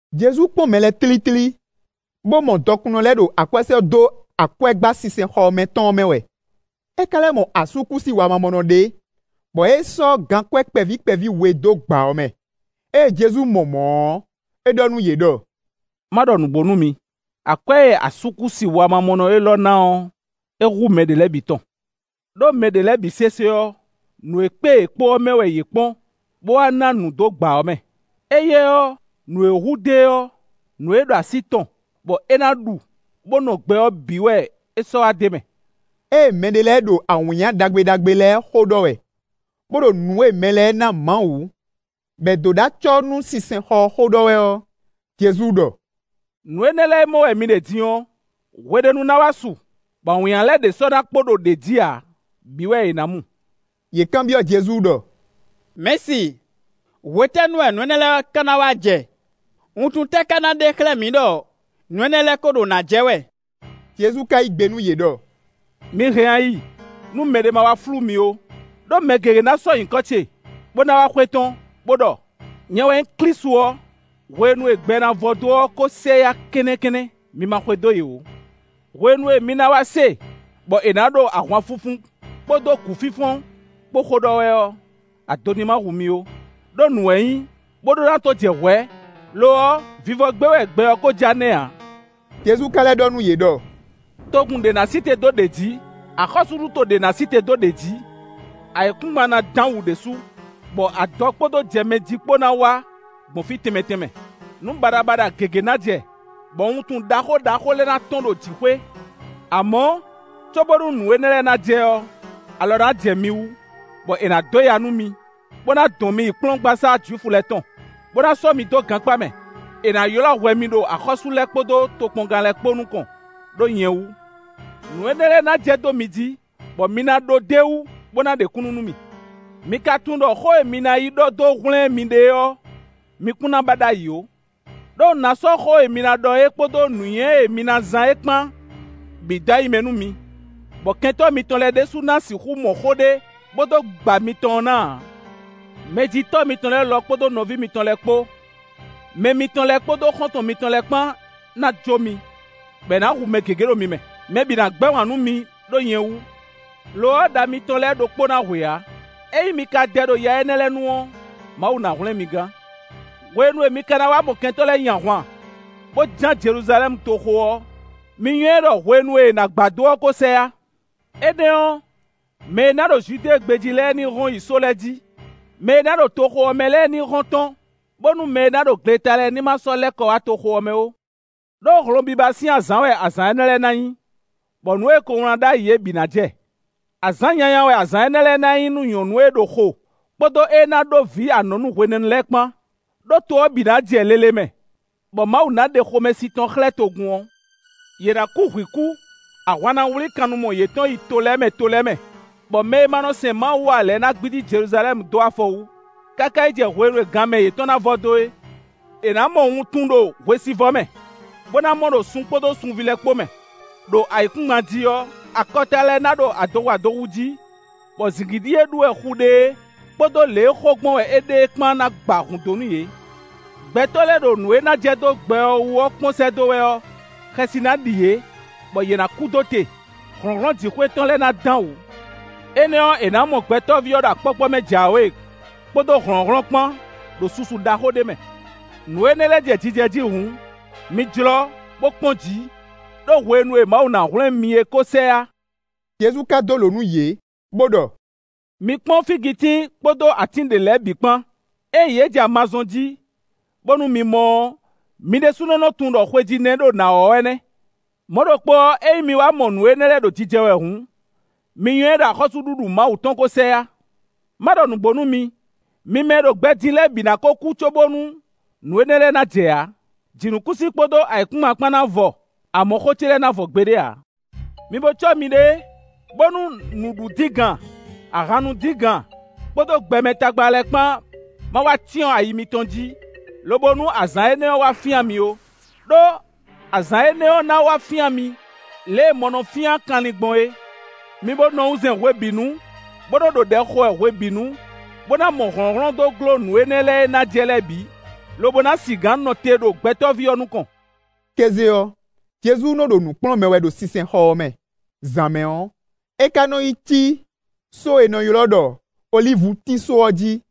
Jezu kpɔ́n mɛ lɛ́ɛ tlítlí, bó mɔ dɔkunnɔ lɛ́ɛ ɖo akwɛ́ sɔ́ dó akwɛ́gbá sinsɛnxɔ mɛ tɔn ɔ́ mɛ wɛ. É ka lɛ́ mɔ asúkúsi wamamɔnɔ ɖé, bɔ é sɔ́ gankwɛ́ kpɛví kpɛví we dó gbǎ ɔ́ mɛ. Ée Jezu mɔ mɔ̌ ɔ́, é ɖɔ nú yě ɖɔ: “Má ɖɔ nǔgbó nú mi; akwɛ́ e asúkúsi wamamɔnɔ élɔ́ ná ɔ́, é hú mɛ ɖě lɛ́ɛ bǐ tɔn. Đó mɛ ɖě lɛ́ɛ bǐ sésé ɔ́, nǔ e kpé yě kpo ɔ́ mɛ wɛ yě kpɔ́n bó wá ná nǔ dó gbǎ ɔ́ mɛ; éyɛ́ ɔ́, nǔ e hu dó e ɔ́, nǔ e ɖo así tɔn, bɔ é ná ɖu, bó nɔ gbɛ ɔ́ bǐ wɛ é sɔ́ wá d'é mɛ.” Ée mɛɖé lɛ́ɛ ɖo awǐnnya ɖagbe ɖagbe lɛ́ɛ xó ɖɔ wɛ, bó ɖo nǔ e mɛ lɛ́ɛ ná Mawu, bɔ è dó ɖó acɔ́ nú sinsɛnxɔ ɔ́ xó ɖɔ wɛ ɔ́, Jezu ɖɔ: “Nǔ énɛ́ lɛ́ɛ e mɔ wɛ mi ɖe din ɔ́, hwe ɖé nu ná wá su, bɔ awǐnnya lɛ́ɛ ɖě sɔ́ ná kpo ɖo ɖě jí ǎ; bǐ wɛ è nǎ mu.” Yě kanbyɔ́ Jezu ɖɔ: “Mɛ̌si, hwetɛ́nu wɛ nǔ énɛ́ lɛ́ɛ ká ná wá jɛ? Wuntun tɛ́ ká ná ɖe xlɛ́ mǐ ɖɔ nǔ énɛ́ lɛ́ɛ ko ɖo nǎ jɛ wɛ?” Jezu ka yí gbe nú yě ɖɔ: “Mi hɛn ayi nú mɛɖé má wá flú mi ó. Đó mɛ gěgé ná sɔ́ nyǐkɔ ce, bó ná wá xwetɔ́n, bó ɖɔ: ‘Nyɛ wɛ nyí Klísu ɔ́;’ hwenu e gbɛ ná vɔ dó ɔ́ ko sɛ yá kɛ́nnɛ́kɛ́nnɛ́; mi ma xwedó yě ó. Hwenu e mi ná wá se bɔ è nǎ ɖo ahwanfunfun kpódó gǔfínfɔ́n kpó xó ɖɔ wɛ ɔ́, ado ní ma hu mi ó, ɖó nǔ wɛ nyí, bó ɖó ná tó jɛ hwɛ̌; lo ɔ́, vivɔ gbé wɛ gbɛ ɔ́ kó ja nɛ́ ǎ.” Jezu ka lɛ́ ɖɔ nú yě ɖɔ: “Togun ɖě ná sí te dó ɖě jǐ; axɔ́súɖuto ɖě ná sí te dó ɖě jǐ. Ayǐkúngban ná dán wǔ ɖésú, bɔ adɔ kpódó jɛmɛjí kpó ná wá gbɔn fí tɛnmɛ tɛnmɛ. Nǔ baɖabaɖa gěgé ná jɛ, bɔ wuntun ɖaxó ɖaxó lɛ́ɛ ná tɔ́n ɖo jǐxwé. “Amɔ̌, cóbónú nǔ énɛ́ lɛ́ɛ ná jɛ ɔ́, alɔ ná jɛ mi wú, bɔ è nǎ dó ya nú mi, bó ná dɔn mi yi kplɔ́ngbasá Jwifu lɛ́ɛ tɔn, bó ná sɔ́ mi dó gankpá mɛ; è nǎ ylɔ́ hwɛ mi ɖo axɔ́sú lɛ́ɛ kpódó tokpɔngán lɛ́ɛ kpó nukɔn, ɖó nyɛ wú. Nǔ énɛ́ lɛ́ɛ ná jɛ dó mi jí, bɔ mi ná ɖó d'é wú, bó ná ɖe kúnnu nú mì. Mi ka tunwun ɖɔ xó e mi ná yi ɖɔ dó hwlɛ́n miɖée ɔ́, mi kún ná ba ɖ'ayǐ ó. Đó un ná sɔ́ xó e mi ná ɖɔ é kpódó nǔnywɛ́ e mi ná zán é kpán bǐ dó ayi mɛ nú mi, bɔ kɛntɔ́ mitɔn lɛ́ɛ ɖěbǔ ná sixú mɔ xó ɖé, bó dó gba mitɔn ɔ́ ná ǎ. Mɛjitɔ́ mitɔn lɛ́ɛ lɔ kpódó nɔví mitɔn lɛ́ɛ kpó, mɛ mitɔn lɛ́ɛ kpódó xɔ́ntɔn mitɔn lɛ́ɛ kpán ná jó mi, bɔ è nǎ hu mɛ gěgé ɖo mi mɛ; mɛ bǐ ná gbɛ́ wǎn nú mi ɖó nyɛ wú. Lo ɔ́, ɖa mitɔn lɛ́ɛ ɖokpó ná hwe ǎ. Ényí mi ka dɛ ɖo ya énɛ́ lɛ́ɛ nu ɔ́, Mawu ná hwlɛ́n mi gán.” “Hwenu e mi ka ná wá mɔ kɛntɔ́ lɛ́ɛ nyi ahwan, bó ján Jeluzalɛ́mu toxo ɔ́, mi nywɛ́ ɖɔ hwenu e è nǎ gba dó ɔ́ kó sɛ yá. Énɛ́ ɔ́, mɛ e ná ɖo Judée gbé jí lɛ́ɛ ní hɔn yi só lɛ́ɛ jí; mɛ e ná ɖo toxo ɔ́ mɛ lɛ́ɛ ní hɔn tɔ́n, bónú mɛ e ná ɖo gleta lɛ́ɛ ní má sɔ́ lɛ́ kɔ wá toxo ɔ́ mɛ ó. Đó hlɔnbiba sín azǎn wɛ azǎn énɛ́ lɛ́ɛ ná nyí, bɔ nǔ e è ko wlán ɖ'ayǐ é bǐ ná jɛ. Azǎn nyanya wɛ azǎn énɛ́ lɛ́ɛ ná nyí nú nyɔ̌nu e ná ɖo xo, kpódó ée ná ɖó vǐ anɔ̌nu hwenɛ́nu lɛ́ɛ kpán; ɖó to ɔ́ bǐ ná jɛ lele mɛ, bɔ Mawu ná ɖe xomɛsin tɔn xlɛ́ togun ɔ́. Yě ná kú hwǐ kú; ahwan ná wlí kannumɔ yětɔn yi to lɛ́ɛ mɛ to lɛ́ɛ mɛ, bɔ mɛ e ma nɔ sɛn Mawu ǎ lɛ́ɛ ná gbídí Jeluzalɛ́mu dó afɔ wú, káká yi jɛ hwenu e gan mɛ yětɔn ná vɔ dó é.” “È nǎ mɔ wuntun ɖo hwesivɔ́ mɛ, bó ná mɔ ɖo sun kpódó sunví lɛ́ɛ kpó mɛ. Đo ayǐkúngban jí ɔ́, akɔta lɛ́ɛ ná ɖo adohu adohu jí, bɔ zǐngídi e ɖú wɛ xu ɖe é, kpódó lě e xo gbɔn wɛ é ɖe é kpán ná gba hǔn dó nú yě. Gbɛtɔ́ lɛ́ɛ ɖo nǔ e ná jɛ dó gbɛ ɔ́ wú ɔ́ kpɔ́n sɛ́ dó wɛ ɔ́, xɛsi ná ɖi yě, bɔ yě ná kú dó te. Hlɔ̌nhlɔ́n jǐxwé tɔn lɛ́ɛ ná dán wǔ. Énɛ́ ɔ́, è nǎ mɔ Gbɛtɔ́ví ɔ́ ɖo akpɔ́kpɔ́ mɛ jǎwe, kpódó hlɔ̌nhlɔ́n kpán, ɖo susu ɖaxó ɖé mɛ. Nǔ énɛ́ lɛ́ɛ jɛ jijɛ jí hǔn, mi jlɔ́, bó kpɔ́n jǐ, ɖó hwenu e Mawu ná hwlɛ́n mi é kó sɛ yá.” Jezu ka dó lǒ nú yě, bó ɖɔ: “Mi kpɔ́n fígitín, kpódó atín ɖě lɛ́ɛ bǐ kpán: Ényí yě jɛ ama zɔ́n jí, bónú mi mɔ ɔ́, mi ɖésúnɔ nɔ tunwun ɖɔ xwejí nɛ́ ɖo nǎ wɔ́ wɛ nɛ́. Mɔ̌ ɖokpó ɔ́, ényí mi wá mɔ nǔ énɛ́ lɛ́ɛ ɖo jijɛ wɛ hǔn, mi nywɛ́ ɖɔ axɔ́súɖuɖu Mawu tɔn kó sɛ yá. Má ɖɔ nǔgbó nú mi: mi mɛ e ɖo gbɛ din lɛ́ɛ bǐ ná kó kú cóbónú nǔ énɛ́ lɛ́ɛ ná jɛ ǎ. Jǐnukúnsin kpódó ayǐkúngban kpán ná vɔ, amɔ̌ xó ce lɛ́ɛ ná vɔ gbeɖé ǎ.” “Mi bo cɔ́ miɖée, bónú nǔ ɖu díngan, ahan nu díngan, kpódó gbɛmɛ tagba lɛ́ɛ kpán má wá cyɔ́n ayi mitɔn jí, lobo nú azǎn énɛ́ ɔ́ wá fyán mi ó; ɖó azǎn énɛ́ ɔ́ ná wá fyán mi, lě e mɔ nɔ fyán kanlin gbɔn é. Mi bo nɔ wunzɛn hwebǐnu, bó nɔ ɖo ɖɛ xo wɛ hwebǐnu, bó ná mɔ hlɔ̌nhlɔ́n dó gló nǔ énɛ́ lɛ́ɛ e ná jɛ lɛ́ɛ bǐ, lobo ná sigǎn nɔ te ɖo Gbɛtɔ́ví ɔ́ nukɔn.” Kéze ɔ́, Jezu nɔ ɖo nǔ kplɔ́n mɛ wɛ ɖo sinsɛnxɔ ɔ́ mɛ; zǎn mɛ ɔ́, é ka nɔ yi cí só e è nɔ ylɔ́ ɖɔ olívutín só ɔ́ jí.